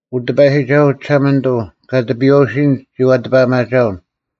ᐅ ᑎᐸᔨᒋᒐᓱᐤ ᒋᓴᒪᓂᑐᐤ, ᑲ ᑎᐱᔨᐛᐅᓯᔨᓐ ᒋᐛ ᑎᐸᐊᒪᒐᐅᓐ;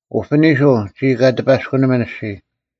ᐅᐱᓂᓱᐤ, ᒋᔾ ᑲ ᑎᐸᔅᑯᓇᒥᓐ ᐊᔅᒋᔾ,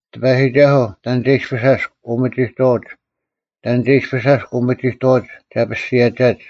ᑎᐸᔨᒋᒐᓱᐤ, ᑕᓐ ᒐ ᐃᔅᐱᔅ ᐊᔅᒄ ᐅᒥᒋᑥᐅᒡ, ᑕᓐ ᒐ ᐃᔅᐱᔅ ᐊᔅᒄ ᐅᒥᒋᑕᐛᒡ ᒐ ᐱᔅᒋᔭᒐᒡ?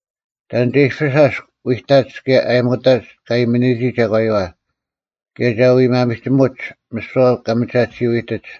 ᑕᓐ ᒐ ᐃᔅᐱᔅ ᐊᔅᒄ ᐎᑕᒡ ᑭᔭ ᐊᔨᒧᑕᒡ ᑲ ᐊᔨᒥᓂᔨᒋ ᒐᒂᔪᐛ? ᑭᔭ ᒐ ᐎᒪᒥᒋᒧᒡ ᒥᓯᐛ ᑲ ᒥᒐᑎᓱᐤ ᐃᑎᒡ?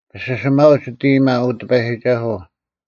ᐱᓯᓯᒪᐅᒡ ᒋᑦ ᐃᔨᒪ, ᐅ ᑎᐸᔨᒋᒐᓱᐤ,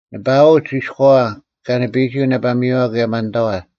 ᓂᐸᐊᐅᒡ ᐃᔎᐛ ᑲ ᓂᐱᔨᒋ ᐅᓇᐸᒥᔪᐛ ᑭᔭ ᒪᓐᑕᐛ,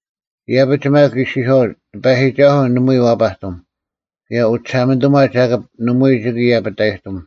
ᐃᔭᐱᒡ ᒪᒃ ᐃᔅᒋᔄᐅᒡ, “ᑎᐸᔨᒋᒐᓱᐤ ᓇᒪᐎᔾ ᐛᐸᑎᒻ, ᑭᔭ ᐅᒋᓴᒪᓂᑐᒪ ᒐᑭᑉ ᓇᒪᐎᔾ ᒋᑭ ᐃᔭᐱᑕᔨᑎᒻ᙮”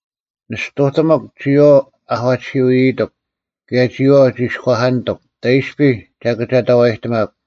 ᓂᔅᑐᑎᒧᒄ, ᒋᔨᐛᐤ ᐛᐧᑲᑎᓯᐤ ᐃᔨᔨᑎᒄ; ᑭᔭ ᒋᔨᐛᐤ ᒋᔎᐧᑲᓂᑐᒄ, ᑕᐃᔅᐱ ᒐ ᑭᒐᑕᐛᔨᑎᒪᒄ?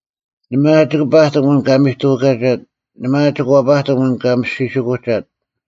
ᓇᒪ ᐊ ᒋᑭ ᐸᑎᒻ ᐊᓐ ᑲ ᒥᑐᐛᑲᒐᑦ? ᓇᒪ ᐊ ᒋᑭ ᐛᐸᑎᒻ ᐊᓐ ᑲ ᒥᔅᒋᓯᑯᒐᑦ?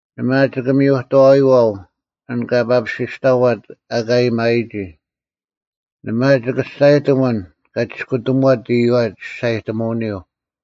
ᓇᒪ ᐊ ᒋᑭ ᒥᔪᑥᐃᐛᐤ ᐊᓐ ᑲ ᐸᐱᓯᔅᑕᐛᑦ ᐊᑲ ᐊᔭᒥᐊᔨᒋ? ᓇᒪ ᐊ ᒋᑭ ᒋᔅᒐᔨᑎᒻ ᐊᓐ ᑲ ᒋᔅᑯᑎᒧᐛᑦ ᐃᔪᐛ ᒋᔅᒐᔨᑎᒧᐅᓂᔪᐤ?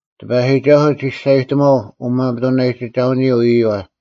ᑎᐸᔨᒋᒐᓱᐤ ᒋᔅᒐᔨᑎᒺᐤ ᐅᒪᒥᑐᓇᔨᒋᒐᐅᓂᔪᐤ ᐃᔪᐛ,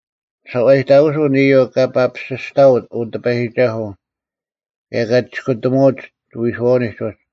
ᓱᐛᔨᑕᑯᓱᐤ ᐊᓐ ᐃᔪᐤ ᑲ ᐸᐱᓯᔅᑕᐅᑦ, ᐅ ᑎᐸᔨᒋᒐᓱᐤ, ᑭᔭ ᑲ ᒋᔅᑯᑎᒧᐅᑦ ᒋᐎᓱᐛᐅᓂᒡ ᐅᒡ;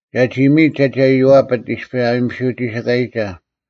ᒐᒋ ᒥᔨᑦ ᒐᒋ ᐊᔽᐱᑦ ᐃᔅᐱ ᐊ ᐊᔨᒥᓯᐤ ᒋᓯᑲᔨᒐ,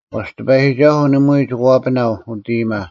ᐛᔅ ᑎᐸᔨᒋᒐᓱᐤ ᓇᒪᐎᔾ ᒋᑭ ᐛᐱᓇᐤ ᐅᑦ ᐃᔨᒪ,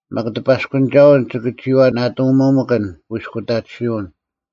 ᒪᒃ ᑎᐸᔅᑯᓂᒐᐅᓐ ᒋᑭ ᒋᐛ ᓇᑕᒧᒪᑭᓐ ᑯᐃᔅᑯᑕᑎᓯᐅᓐ,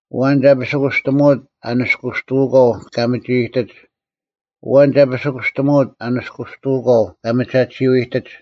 ᐊᐛᓐ ᒐ ᐱᓯᑯᔅᑎᒧᐅᑦ ᐊ ᓂᔅᑯᔅᑐᐅᒂᐤ ᑲ ᒥᒋᐃᑎᒡ? ᐊᐛᓐ ᒐ ᐱᓯᑯᔅᑎᒧᐅᑦ ᐊ ᓂᔅᑯᔅᑐᐅᒂᐤ ᑲ ᒥᒐᑎᓯᐤ ᐃᑎᒡ?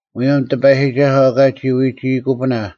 ᒧᔭᒻ ᑎᐸᔨᒋᒐᓱᐤ ᐊᑲ ᒋ ᐎᒋᐃᑯᐱᓇ,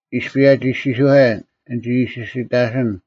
ᐃᔅᐱ ᐊᒋ ᐃᔅᒋᔄᔭᓐ “ᓂᒋ ᐃᓯᓯᑕᓯᓐ!”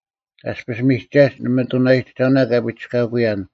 ᐊᔅᐱᔅ ᒥᒐᒡ ᓂ ᒥᑐᓇᔨᒋᒐᐅᓇ ᑲ ᐱᒋᔅᑲᑯᔭᓐ,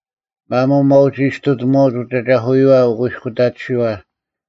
ᒪᒧᐤ ᒪᐛᐅᒋᐃᑐᔅᑕᒪᐅᒡ ᐅᑦ ᐊᒐᐧᑯᔪᐛ ᐅᑯᐃᔅᑯᑕᑎᓯᐛ,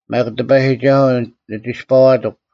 ᒪᒃ ᑎᐸᔨᒋᒐᓱᐤ ᓂ ᒋᔅᐸᐛᑎᒄ;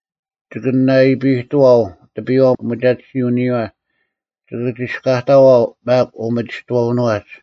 ᒋᑭ ᓇᐃᐱᑐᐛᐤ ᑎᐱᔽ ᐅᒥᒐᑎᓯᐅᓂᔨᐛ, ᒋᑭ ᒋᔅᑲᑕᐛᐤ ᒪᒃ ᐅᒥᒋᑥᐅᓄᐛᒡ;